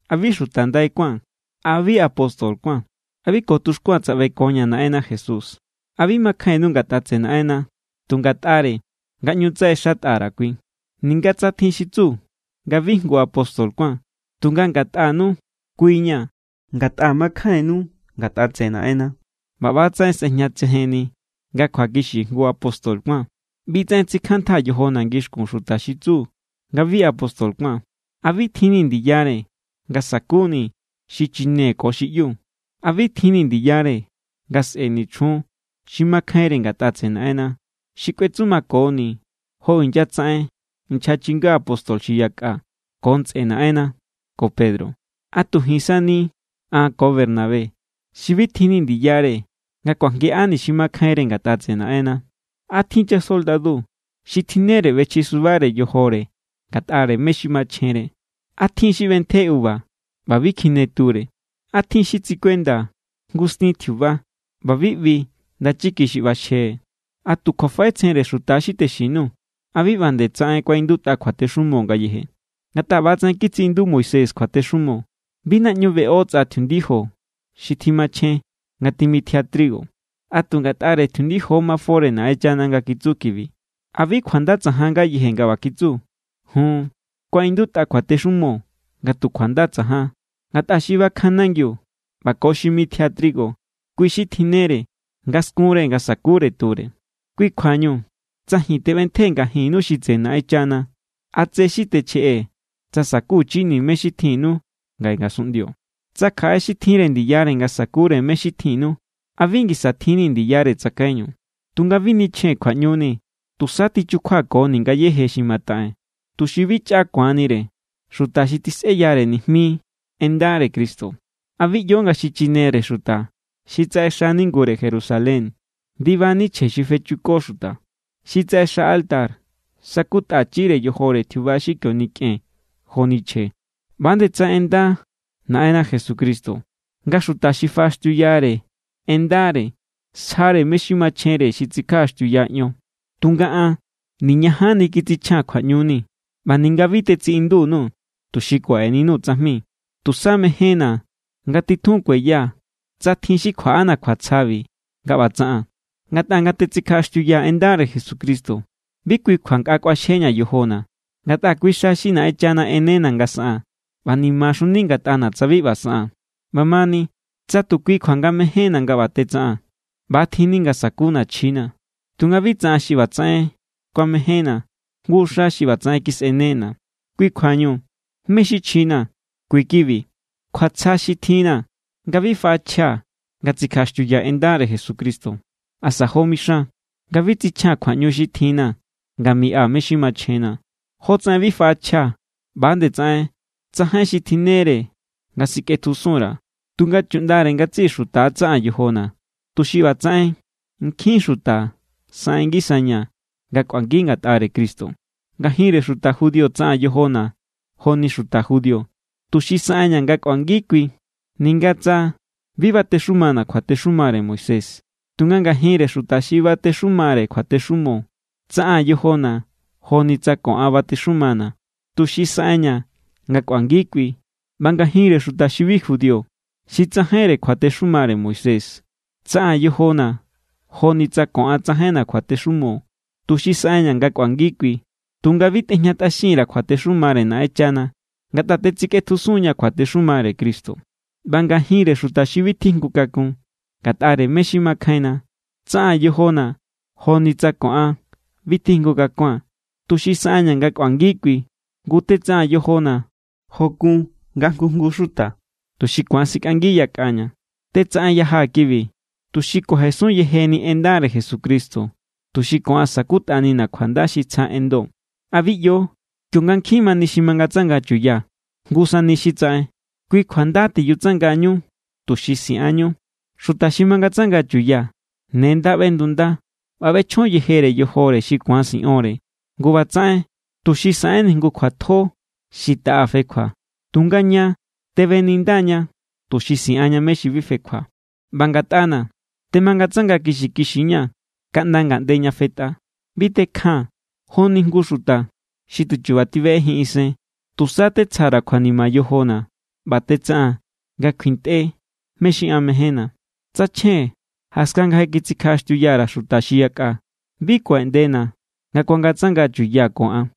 ¿A bi xuta ndai kuáa̱n? ¿A bi apóstol kuáa̱n? ¿A bi ko tuxkuaa̱n tsaꞌbekoña̱ Naꞌenna Jesús? ¿A bi makjainnu ngatꞌa tseꞌe Naꞌenna tu ngatꞌare nga ꞌñu tsaꞌexatꞌa_ra̱ kui? Ninga tsa tjin xi tsu nga bi jngu apóstol kuáa̱n, tunga ngatꞌanu kui= ña̱. Ngatꞌa makjainnu ngatꞌa tseꞌe Naꞌenna, ꞌba ꞌba=tsaꞌen sꞌejñatsejenni nga kjuakixi jngu apóstol kuáa̱n. ꞌBi=tsaꞌen tsikjantꞌaa̱ yojona̱ ngixkun xuta xi tsu nga bi apóstol kuáa̱n: ¿A bi tjinni̱ ndiyare nga sakuni̱ xichine ko xi ꞌyu? ¿A bi tjinni̱ ndiyare nga sꞌe̱ni chjun xi makjainre ngatꞌa tseꞌe Naꞌenna, xi kꞌuetsumakoni jo inyatsaꞌen nchja chinga apóstol xi yakꞌa ko ntsꞌe Naꞌenna ko Pedro? ¿A tu ji̱n sani an ko Bernabé xi bi tjinni̱ ndiyare nga kuajngiꞌani̱ xi makjainre ngatꞌa tseꞌe Naꞌenna? ¿A tjin= chasoldadu xi tjinnere ꞌbechjisubare yojore ngatꞌare mé= xi machjenre? ¿A tjin= xi ꞌbentje uva ꞌba bi kjine ture? ¿A tjin= xi tsikuenda jngu stin tjiuba ꞌba bi ꞌbi ndachiki xi ꞌbaxje? ¿A tu kjuafaꞌetsjenre xuta= xi texin_nuu̱? ¿A bi ꞌba nde tsaꞌen kuaꞌindutꞌa kjuatexumo ngayeje? Ngatꞌa ꞌba=tsaꞌen kitsiꞌindu Moisés kjuatexumo: “Bi naꞌñu beꞌo tsꞌa tjiundijo xi tjimachjen nga timitjia trigo.” ¿A tu ngatꞌare tjiundijo= mafore Naꞌenchana nga kitsu kibi? ¿A bi kjuanda tsajan ngayeje nga ꞌba kitsu? Jun, kuaꞌindutꞌa kjuatexumo nga tu kjuanda tsajan. Ngatꞌa xi bakjan nangiu ꞌba ko xi mitjia trigo, kui= xi tjinnere nga skunre nga sa̱kure ture. Kui= kjuañu, tsa ji̱n teꞌbentjee̱ ngajinnu xi tseꞌe Naꞌenchana, ¿a tse xi techjeꞌee̱ tsa sa̱kuchini̱ mé= xi tjinnu ngaꞌe ngasunꞌndio? Tsa kjaꞌe xi tjinre ndiyare nga sa̱kure mé= xi tjinnu, ¿a bi ngisa tjinni̱ ndiyare tsakaiñu? Tunga bi nichjee̱n kjuaꞌñuni. Tusa tichukjuakoni̱ ngayéje xi mataꞌee̱n, tuxi bi chꞌa ku̱anire xuta xi tisꞌeyare nijmi en ndare Cristo. ¿A bi ꞌyo nga xi chinere xuta xi tsaꞌexa ningure Jerusalén= ndibani chje xi fechuko xuta? Xi tsaꞌexatꞌa altar sakutꞌachire yojore tjiuba xi kio nikꞌen joni chje. ꞌBa=nde tsaꞌen ꞌenda Naꞌenna Jesucristo nga xuta xi faꞌaxtiuyare en ndare sjare mé= xi machjenre xi tsikjaꞌaxtiuya ion. Tunga an niñajanni kitsichjaa̱n kjuaꞌñuni. ꞌBa ninga bi tetsiꞌindu_nuu̱ tuxi kuaꞌeninuu̱ tsajmi. ¡Tu̱sá mejénna̱ nga titjun kueya tsa tjin xi kjuaꞌana̱ kjuatsjabi nga ꞌba tsaꞌaa̱n! Ngatꞌa nga tetsikjaꞌaxtiuyaa̱ en ndare Jesucristo, bi kui kjua nkꞌa kꞌuaxjeña̱ yojona̱. Ngatꞌa kui xa xi Naꞌenchana ꞌenena̱ nga saꞌaa̱n. ꞌBa nimaxuni ngatꞌana̱ tsa bi ꞌba saꞌaa̱n. ꞌBamani, tsa tu kui kjua nga mejénna̱ nga ꞌba tetsaꞌaa̱n, ꞌba=tjinni nga sa̱kuna̱ chjina̱. Tunga bi tsa an xi ꞌbatsaꞌen kuamejénna̱, jngu xa xi ꞌbatsaꞌen kisꞌenena̱. Kui kjuañu, ¿mé= xi chjina̱? Kui= kibi. Kjuatsja xi tjinna̱ nga bi faꞌachjia̱ nga tsikjaꞌaxtiuyaa̱ en ndare Jesucristo, asa jo mixan nga bi tsichjia̱n kjuaꞌñu xi tjinna̱ nga miꞌa mé= xi machjenna̱. Jotsaꞌen bi faꞌachjia̱ ꞌba=nde tsaꞌen tsajain xi tjinnere nga sikꞌetjusun_ra̱, tunga chuꞌndare ngatsiꞌi xuta= tsaꞌaa̱n yojona̱, tuxi ꞌbatsaꞌen nkjin xuta saꞌen ngisaña̱ nga kꞌuangi ngatꞌare Cristo. Ngajinre xuta judío tsaꞌaa̱n yojona̱ joni xuta judío, tuxi saꞌenña̱ nga kꞌuangi kui. Ninga tsa bi batexumana̱ kjuatexumare Moisés, tunga ngajinre xuta xi batexumare kjuatexumo tsaꞌaa̱n yojona̱ joni tsa ko an batexumana̱, tuxi saꞌenña̱ nga kꞌuangi kui. ꞌBa ngajinre xuta xi bi judío, xi tsajainre kjuatexumare Moisés, tsaꞌaa̱n yojona̱ joni tsa ko an tsajainna̱ kjuatexumo, tuxi saꞌenña̱ nga kꞌuangi kui. Tunga bi tejñatꞌaxin_ra̱ kjuatexumare Naꞌenchana, ngatꞌa tetsikꞌetjusun=ña̱ kjuatexumare Cristo. ꞌBa ngajinre xuta xi bi tjijngu kakun ngatꞌare mé= xi makjainna, tsaꞌaa̱n yojona̱ joni tsa ko an bi tjijngu kakua̱n, tuxi saꞌenña̱ nga kꞌuangi kui. Ngu, tetsaꞌaa̱n yojona̱ jó= kun nga jngu jngu xuta, tuxi ku̱an sikꞌangi yakꞌaña̱. Tetsaꞌenyajaa̱ kibi tuxi kuajesun yejeni en ndare Jesucristo, tuxi ko an sa̱kutꞌanina̱ kjuanda xi tsja enndo. ¿A bi ꞌyo, kionga nkjin mani xi mangatsanga chuya, jngu sani xi tsaꞌen? Kui kjua nda tiyutsangañu, tuxi siꞌanñu. Xuta xi mangatsanga chuya ne nda ꞌbendunda ꞌba ꞌbechjon yejere yojore xi ku̱an siꞌonre. Ngu ꞌbatsaꞌen tuxi saꞌenni jngu kjuatjo xi taꞌa fekjua. Tunga ña tebeninda=ña tuxi siꞌanña mé= xi bi fekjua. ꞌBa ngatꞌana̱, temangatsanga kixikixiña̱ kaꞌnda ngaꞌnde ña fetꞌa. Bi tekjaa̱n joni jngu xi tu chu̱ba̱ tibeꞌejin isen. Tusa tetsja_ra̱ kjuanima yojona̱ ꞌba tetsaꞌaa̱n nga kjuintꞌe mé= xi an mejénna̱. Tsa chjen, jaskan nga je kitsikjaꞌaxtiuya_ra̱ xuta xi yakꞌa, bi kuaꞌeꞌndena̱ nga ku̱angatsangaa̱ chuya ko an.